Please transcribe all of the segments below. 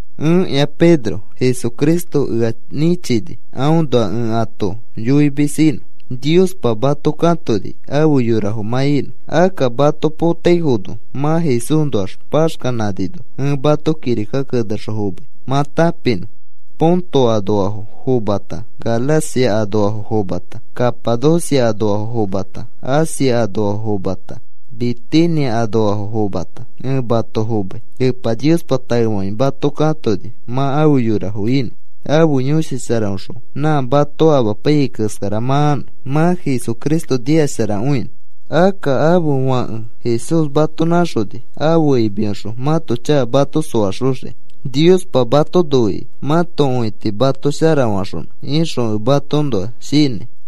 Ẽkĩa Pedro. Jesucristo ea nĩchini aõnoa ẽ ato yoimis inõ. Niospa mato katoni afe yorafo mã inõ. Akka mato potaifono mã Jesúsnoax paxkanãnino ẽ mato kirika kenexõ fomai mã tãpinõ. Ponto anoafo fomata, Galacia anoafo fomata, Capadocia anoafo fomata, Asia anoafo fomata, Bitinia anoafo fomata, ẽ mato fomai. Epa Niospa taefakĩ mato katoni mã afe yorafo inõ, ãfe Yõshi Sharaõxõ nã mato amapaiyai keskara mã anõ, mã Jesucristo nikasharakõinõ. Akka ãfe Fãke Jesús mato nãxoni ãfe imiõxõ mãto chaka mato soaxoxiki. Niospa mato noikĩ mãto õiti mato sharafaxonõ ixõ ẽ matoõnoa shinãi.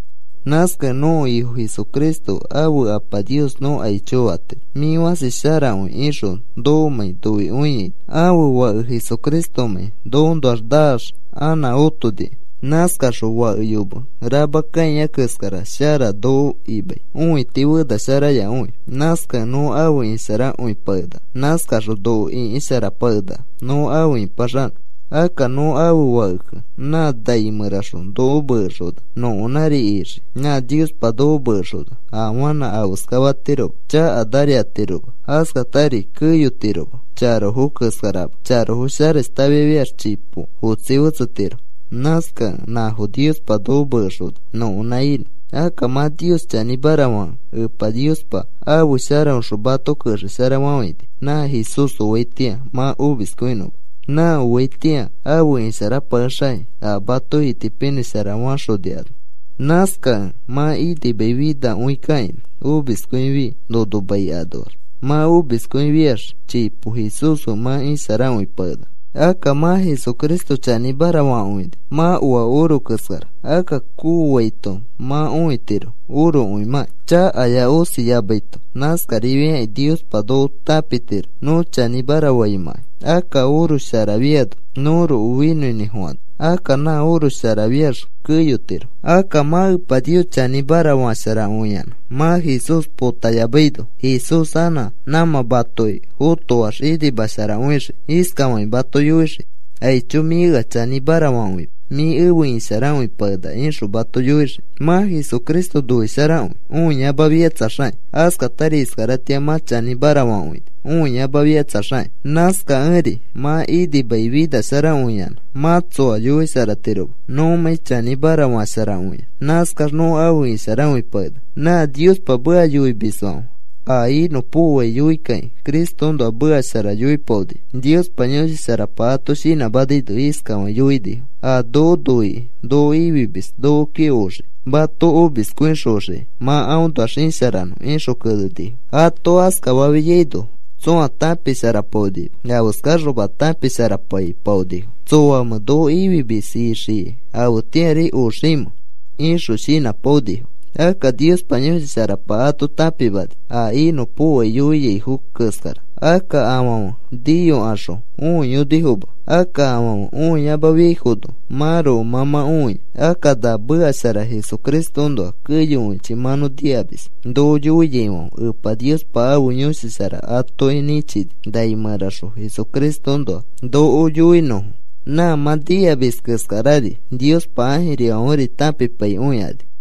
Nãskakẽ nõko Ifo Jesucristo ãfe Apa Nios nõ aicho fatiro: “Mĩ fãsi sharakõi,” ixõ nokomãi noikõiaino ãfe Fake Jesucristomãi nõkoõnoax naax anã otonikẽ. Nãskaxõ fake yome rama kãia keskara shara noko imai õiti fenasharayakõi. Nãskakẽ nõ afe isharakõipakenaka. Nãskaxõ noko ĩkisharapakenaka nõ afe ipaxanõ. Akka nõ ãfe fakekẽ nã nai mẽraxõ noko mekexona nõkonãri ixii. Nã Niospa noko mekexona afanã afeskafatiroma, chakanari atiroma, askatari keyotiroma. Charofo keskarama. Charofo sharashtafiax chipo otsi fetsetiro. Nãskakẽ nãfo Niospa noko mekexona nõkonã inõ. Akka mã Nios chanĩmara fakẽ, Epa Niospa ãfe sharaõxõ mato kexesharafafãini nã Jesús oaitĩa mã omiskõinõma, nã oaitĩa afe isharapakexakĩ a mato itipinĩshara faxoni ano. Nãskakẽ mã inimai finakõikakaini, omiskõifi nono mai anoax. Mã omiskõifiax chipo Jesús fe mã isharakõipakenaka. Akka mã Jesucristo chanĩmara fakõini mã oa oro keskara. Akka kooaito mã õitiro orokõimãki, chakaya osiyamaito. Nãskarifiakĩ Niospa noko tãpitiro nõ chanĩmara faimãkai, akka oro sharafiano nõroko finõinĩfofana. Akka nã oro sharafiax keyotiro. Akka mã Epa Nios chanĩmara fasharakõiyanã mã Jesús potayamaino Jesús anã nãmã matoki fotoax inimasharakõixii. Iskafakĩ mato yoixii: “Aicho, mĩ ea chanĩmara fakõimis. Mĩ efe isharakõipakenaka,” ixõ mato yoixii. Mã Jesucristo noisharakõi õiyamafikatsaxakĩ. Askatari iskaratĩa mã chanĩmara fakõini õiyamafikatsaxakĩ. Nãskakẽri mã inimai finasharakõiyanã mã tsoa yoisharatiroma. Nõmãi chanĩmara fasharakõiax, nãskax nõ afe isharakõipakenaka. Nã Niospa meka yoimisfãfe a inõpokoai yoikakĩ Cristoõnoa meka shara yoipaonifo, Niospa Yõshi Sharapa ato shinãmanaino. Iskafakĩ yoinifo: “A noko noikĩ noko ifimis nokoki oxii, mato omiskõixoxiki mã aõnoax isharanõ,” ixõ kenenifo. Ato askafafiaino tsõa tãpisharapaonima afeskaxoma tãpisharapaipaonifo. ¿Tsoamẽ noko ifimis ixiai afetĩari oximẽ? ixõ shinãpaipaonifo. Akka Niospa Yõshi Sharapa ato tãpimani a inõpokoai yoiaifo keskara, akka afãfe niyokaxõ õiyonifoma. Akka afãfe õiyamafiaifono mãroko mã mã õia. Akka na meka shara Jesucristoõnoa keyokõichi mã nõ nikamis. Noko yoiaifãfe Epa Niospa ãfe Yõshi Shara atoki nĩchini nai mẽraxõ Jesucristoõnoa noko yoinõfo. Nã mã nikamis keskarari Niospa ãjirifãferi tãpipaikõikani.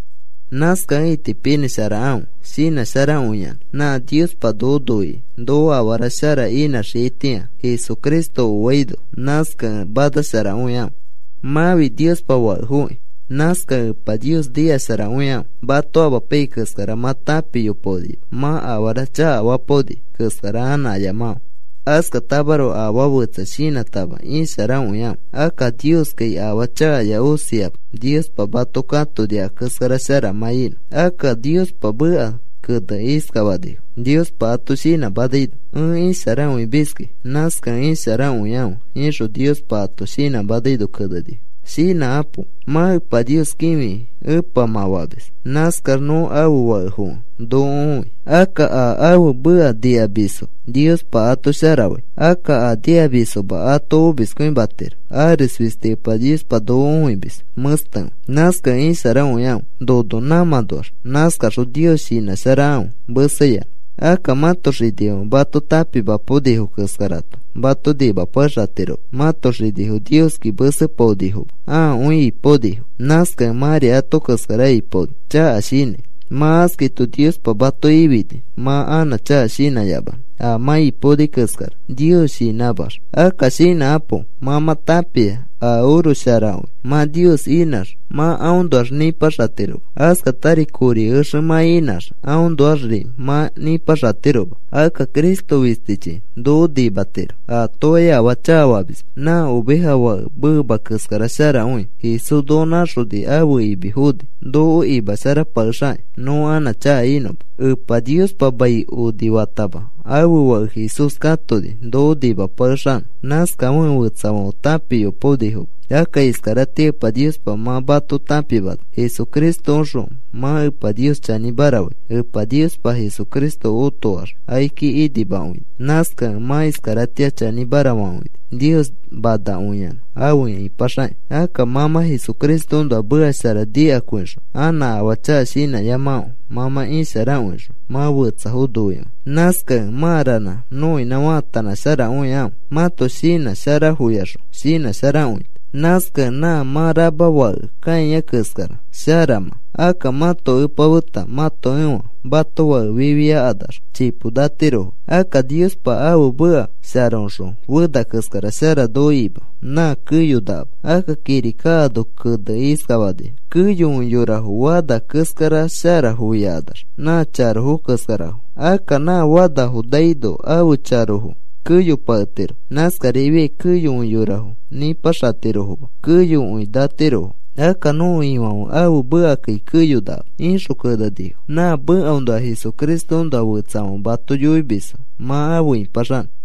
Nãskakẽ itipinĩsharakãfe shinãsharakõiyanã. Nã Niospa noko noikĩ noko afara shara inãxiaitĩa Jesucristo oaino. Nãskakẽ manasharakõikãfe. Mãfi Niospa fakefoki. Nãskakẽ Epa Nios nikasharakõikãfe. Mato amapaiyai keskara mã tãpiyopaonima. Mã afara chakafapaoni keskara anã ayamakãfe. Askatamaroko afaa fetsa shinãtama isharakõikãfe. Akka Nioskai afaa chakaya osiama. Niospa mato katoni a keskara shara mã inõ. Akka Niospa meka kenekĩ iskafanifo Niospa ato shinãmanaino: “Ẽ isharakõimiski. Nãskakẽ isharakõikãfe,” ixõ Niospa ato shinãmanaino kenenifo. Shinãkapo. Mã Epa Nios kĩfikĩ Epa mã famis. Nãskax nõ ãfe fakefokẽ noko õi. Akka a ãfe meka nikamisfo Niospa ato shara fai. Akka a nikamisfoma ato omiskõimatiro. Ares fisti Epa Niospa noko õimis mẽstekõi. Nãskakẽ isharakõikãfe nono nãmãnoax. Nãskaxõ Nios shinãsharakãfe meseyanã. Akka mãto xinifãfe mato tãpimapaonifo keskarato mato nimapakexatiroma. Mãto xinifo Nioski mesepaonifoma. Ãakõi ipaonifo. Nãskakẽ mãri ato keskara ipaoni chaka shinãi. Mã askaito Niospa mato ifini mã anã chaka shinãyamanõ a mã ipaoni keskara Nios shinãmax. Akka shinãkapo. Mã mã tãpia a oro sharakõi mã Nios inãx mã aõnoax nĩpaxatiroma. Askatari kori exe mã inãx aõnoaxri mã nĩpaxatiroma. Akka Cristo fistichi noko nimatiro. Atokai afaa chakafamisma, nã oveja fake meema keskara sharakõi. Jesús noko nãxoni ãfe imi foni noko imasharapakexakĩ nõ anã chaka inõma. Epa Niospa mai onifatama ãfe Fake Jesús katoni noko nimapakexanõ. Nãskafekẽ fetsafãfe tãpiyopaonifoma, akka iskaratĩa Epa Niospa mã mato tãpimana. Jesucristoõxõ mã Epa Nios chanĩmara fai, Epa Niospa Jesucristo otoax akiki inimakõini. Nãskakẽ mã iskaratĩa chanĩmara fakõini, Nios manakõiyanã afe ipaxakĩ. Akka mã mã Jesucristoõnoa meka shara nikakõixõ anã afaa chaka shinãyamakĩ. Mã mã isharakõixõ mã fetsafo noikõi. Nãskakẽ mãa ranã nõinã faatanãsharakõikãfe mãto shinã sharafoyaxõ shinãsharakõita. Nãskakẽ nã mã rama fake kãia keskara shara mã. Akka mãto epa feta mãto ẽfa mato fake fifiakanax chipo natirofo. Akka Niospa ãfe meka sharaõxõ fena keskara shara noko ima, nã keyonakama. Akka kirika ano kenekĩ iskafanifo: Keyokõi yorafo fana keskarafo, sharakõifikanax nã charofo keskarafo. Akka nã fanafo naino ãfe charofo keyopaketiro. Nãskarifiai keyokõi yorafo nĩpaxatirofoma, keyokõi natirofo. Akka nõko Ifãfe ãfe mekakai keyonakama, ixõ kenenifo. Nã mekaõnoa Jesucristoõnoa fetsafãfe mato yoimisfo mã afe ipaxanõ.